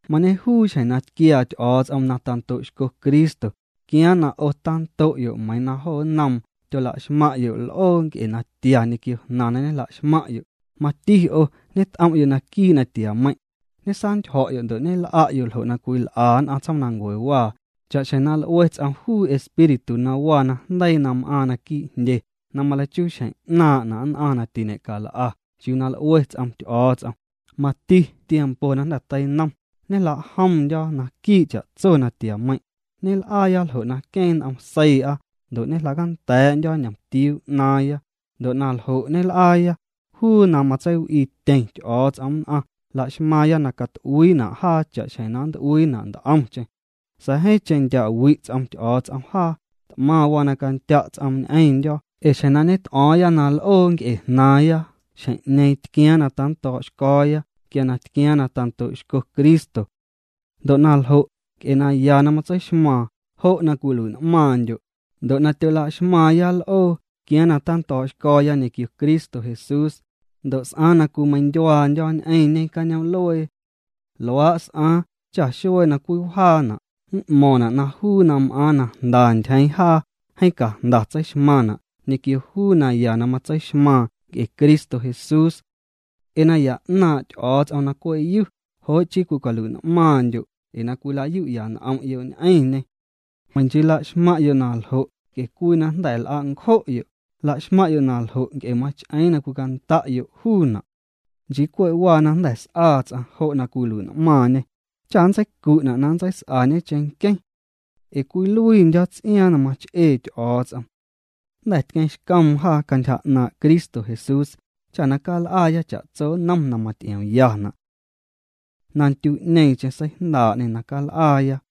Mañejuu xjeⁿ na tquiaa Ty'o̱o̱ts'om na ta'ndo' xco Cristo tquiaaⁿ na 'o tando'yo' meiiⁿ na jo nnoom tyola'xmaⁿ'yo' l'oo nc'e natia ñequio jnaⁿ na ñejla'xmaⁿ'yo', mati 'o ñet'om'yo' naquii' natiameiⁿ', ñesantyjo̱'yo' ndo' ñel'a'yo' ljo' na cwil'a nn'aⁿ tsjoomnancuewaa, cha'xjeⁿ na l'ue ts'om juu espíritu na waa najndeii na m'aaⁿ naquii' jndye na maleichuu xjeⁿ 'naaⁿ'na' nn'aⁿ na tiñe'cal'a chiuu na l'ue ts'om Ty'o̱o̱ts'om. Mati tiempo na jnda̱ teinom ñejla'jomndyo̱ naquii' cha'tso natiameiⁿ', ñel'aaya ljo' na queeⁿ n'om seii'a ndo' ñejla'canda̱a̱'ndyo̱ ñ'omtiuu 'naaⁿya. Ndo' na ljo' ñel'aaya, juu na matseiw'iityeⁿ Ty'o̱o̱ts'om nn'aⁿ laxmaaⁿya na cat'uiina' jaa cha'xjeⁿ na nnt'uiina' nt'omcheⁿ. Sa̱a̱ jeeⁿcheⁿ ndya' wi' ts'om Ty'o̱o̱ts'om jaa. T'maⁿ waa na candya' ts'oom ñ'eⁿndyo̱, ee xjeⁿ na ñet'o̱o̱ⁿya na l'oo nc'e jnaaⁿya, xjeⁿ'ñeeⁿ tquiaaⁿ na tando̱o̱'xco̱o̱ya quia na tquiaaⁿ na tando'xco Cristo. Ndo' na ljo', nc'e naya na matseixmaaⁿ, jo' na cwiluii'n'maaⁿndyo'. Ndo' na tyolaxmaaⁿya l'oo tquiaaⁿ na tando̱o̱'xco̱o̱ya ñequio Cristo Jesús, ndo' s'aaⁿ na cwimeiⁿndyuaandyo̱ ñ'eⁿñe cañoom'luee. Luaa' s'aaⁿ cha xuee na cwiwjaana' m'mo̱ⁿna' na juu na m'aaⁿ na jnda ntyjeeⁿ jaa, jeeⁿ cajnda tseixmaⁿna' ñequio juu naya na matseixmaaⁿ nc'e Cristo Jesús. Nc'e naya 'naaⁿ' Ty'o̱o̱ts'om na cwe' yu, jo' chii cwicaluii'n'maaⁿndyo' ee na cwila'yu'ya' n'om'yo' ñ'eⁿñê. Meiⁿ nchii laxmaⁿ'yo' na ljo' nc'e cwii na jnda̱ l'a' ncjo'yo', laxmaⁿ'yo' naljo' nc'e mach'eeⁿ na cwicanda'yo' juuna'. Nchii cwe' waa na jnda̱ s'aa ts'aⁿ jo' na cwilui'n'maaⁿñê, cha nntseicu'na' na nntseis'añe cheⁿnqueⁿ. Ee cwiluiindyo̱ ts'iaaⁿ na mach'ee Ty'o̱o̱ts'om. Jnda̱ tqueeⁿxcoom jaa cantyja 'naaⁿ' Cristo Jesús cha na cal'aaya cha'tso nnom na maty'iomyana' na ndyu'ñeeⁿcheⁿ seijndaa'ñê na cal'aaya.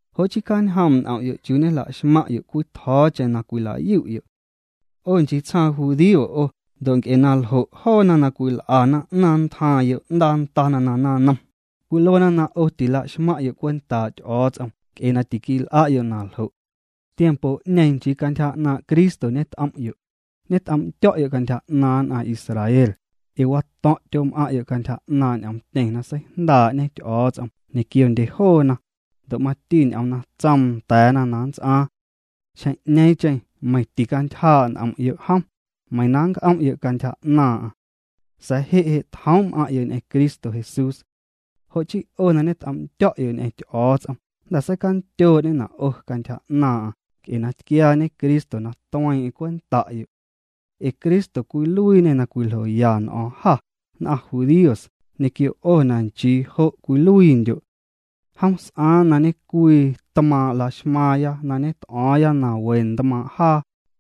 Jo' chii cjañjoom' n'om'yo' chiuu ñejla'xmaⁿ'yo' cwitjo̱o̱cheⁿ na cwila'yu'yo'. 'O nchii tsjaaⁿ judío 'o ndo' nc'e naljo' joona na cwil'ana 'naaⁿ ntjaaⁿ yo'ndaa ndana na naⁿnom, cwiluena na 'o tila'xmaⁿ'yo' cwentaa' Ty'o̱o̱ts'om nc'e na tiquil'a'yo' naljo'. Tiempo'ñeeⁿ nchii cantyja 'naaⁿ' Cristo ñet'om'yo', ñet'om'ndyo̱'yo' cantyja 'naaⁿ nn'aⁿ Israel, ee wato̱ⁿ' tyom'aⁿ'yo' cantyja 'naaⁿ' ñ'oomtyeⁿ na seijndaa'ñe Ty'o̱o̱ts'om ñequiondye joona, ndo' mati ñ'oom na tsoom nda̱a̱na na nnts'aaⁿ. Xjeⁿ'ñeeⁿcheⁿ meiⁿ ticantyjaa' n'om'yo' jom, meiⁿ na nnc'om'yo' cantyja 'naaⁿ'aⁿ. Sa̱a̱ je' je' tjoom' m'aⁿ'yo' ñ'eⁿ Cristo Jesús. Jo' chii 'o na ñet'om'ndyo̱'yo' ñ'eⁿ Ty'o̱o̱ts'om jnda̱ seicandyoo'ñena' 'o cantyja 'naaⁿ'aⁿ nc'e na tquiaañe Cristo na tueeⁿ'eⁿ cwenta'yo'. Ee Cristo cwiluiiñê na cwiljoya n'o̱o̱ⁿ jâ nn'aⁿ judíos ñequio 'o na nchii jo' cwiluiindyo'. Jom s'aaⁿ na ñecwii tmaaⁿ' laxmaaⁿya na ñet'o̱o̱ⁿya na we tmaaⁿ' jaa,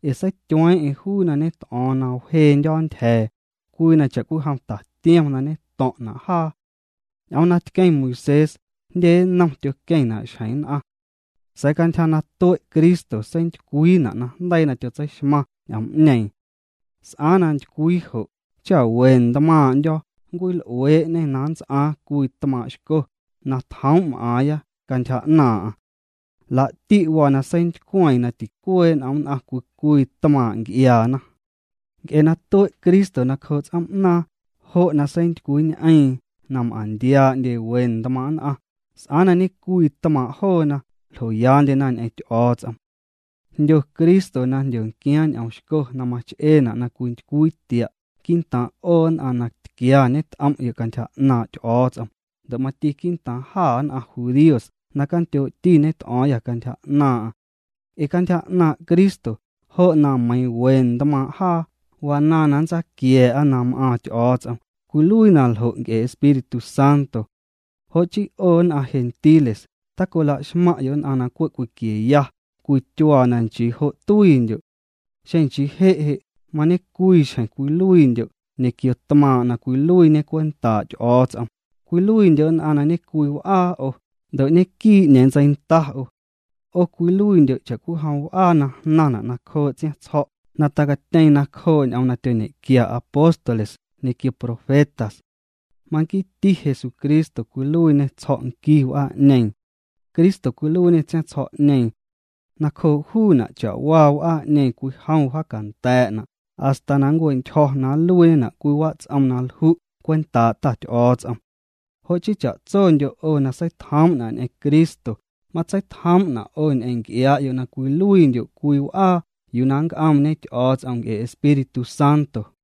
ee seityueeⁿ'eⁿ juu na ñet'o̱o̱ⁿ na wjeendyo̱ ntyja̱a̱ cwii na cha'cwijom tatiom na ñeto̱ⁿ'na' jaa. Ñ'oom na tqueⁿ Moisés jndye nnom tyoqueⁿna' xjeⁿ nn'aⁿ. Sa̱a̱ cantyja na tue' Cristo seintycwiina' najndeii na tyotseixmaⁿ ñ'oom'ñeeⁿ. S'aaⁿ na ntycwii jo' cha we ntmaaⁿ'ndyo̱ nncwil'uee'ñê na nnts'aaⁿ cwii tmaaⁿ' xco na tjoom' m'aaⁿya cantyja 'naaⁿ'aⁿ. Laa'ti' waa na seintycweeⁿ na ticuee' n'om nn'aⁿ cwii cwii tmaaⁿ' nc'iaana. Nc'e na tue' Cristo nacjoo' ts'oom'naaⁿ jo' na seintycwiiñ'eeⁿ na m'aⁿntiaa'ndye we ntmaaⁿ' nn'aⁿ, s'aaⁿ na ñecwii tmaaⁿ' joona, ljoyaandyena ñ'eⁿ Ty'o̱o̱ts'om. Jndyo Cristo na jndyonquiaaⁿ ñ'oom xco na mach'eena' na cwintycwii tia' quii'ntaaⁿ' 'o nn'aⁿ na tquia ñet'om'yo' cantyja 'naaⁿ' Ty'o̱o̱ts'om, ndo' mati quii'ntaaⁿ jâ nn'aⁿ judíos na candyoo'ti ñet'o̱o̱ⁿyâ cantyja 'naaⁿ'aⁿ. Nc'e cantyja 'naaⁿ' Cristo jo' na meiiⁿ we ntmaaⁿ' jaa, wanaaⁿ na nntsaquia̱a̱'a na m'aaⁿ Ty'o̱o̱ts'om, cwiluii na ljo' nc'e Espíritu Santo. Jo' chii 'o nn'aⁿ gentiles tacola'xmaⁿ'yo' nn'aⁿ na cwe' cwiquieya cwii tyuaa na nchii jo' tuiindyo'. Xeⁿ nchii je' je' mañecwii xjeⁿ cwiluiindyo' ñequio tmaaⁿ' na cwiluiiñe cwentaa' Ty'o̱o̱ts'om, cwiluiindyo' nn'aⁿ na ñecwii w'aa 'o, ndo' ñequii 'ñeeⁿ ntseinda 'o. 'O cwiluiindyo' cha'cwijom w'aa na jnaⁿna' nacjoo' ts'iaⁿtsjo̱', na tacatyeeⁿ nacjoo' ñ'oom na tyoñequia apóstoles ñequio profetas. Manquiiti Jesucristo cwiluiiñê tsjo̱' nqui w'aa'ñeeⁿ. Cristo cwiluiiñê tsiaⁿtsjo̱'ñeeⁿ. Nacjoo' juuna' cha'waa w'aa'ñeeⁿ cwijom wjaacanda̱a̱'na' hasta na ncue'ntyjo̱ na nluiiñena' cwii wats'om na lju' cwentaa' Ta Ty'o̱o̱ts'om. Jo' chii cha'tsondyo' 'o na seitjoom'na' ñ'eⁿ Cristo matseitjomna' 'o ñ'eⁿ nc'iaa'yo' na cwiluiindyo' cwii w'aa yuu na nnc'oomñe Ty'o̱o̱ts'om nc'e Espíritu Santo.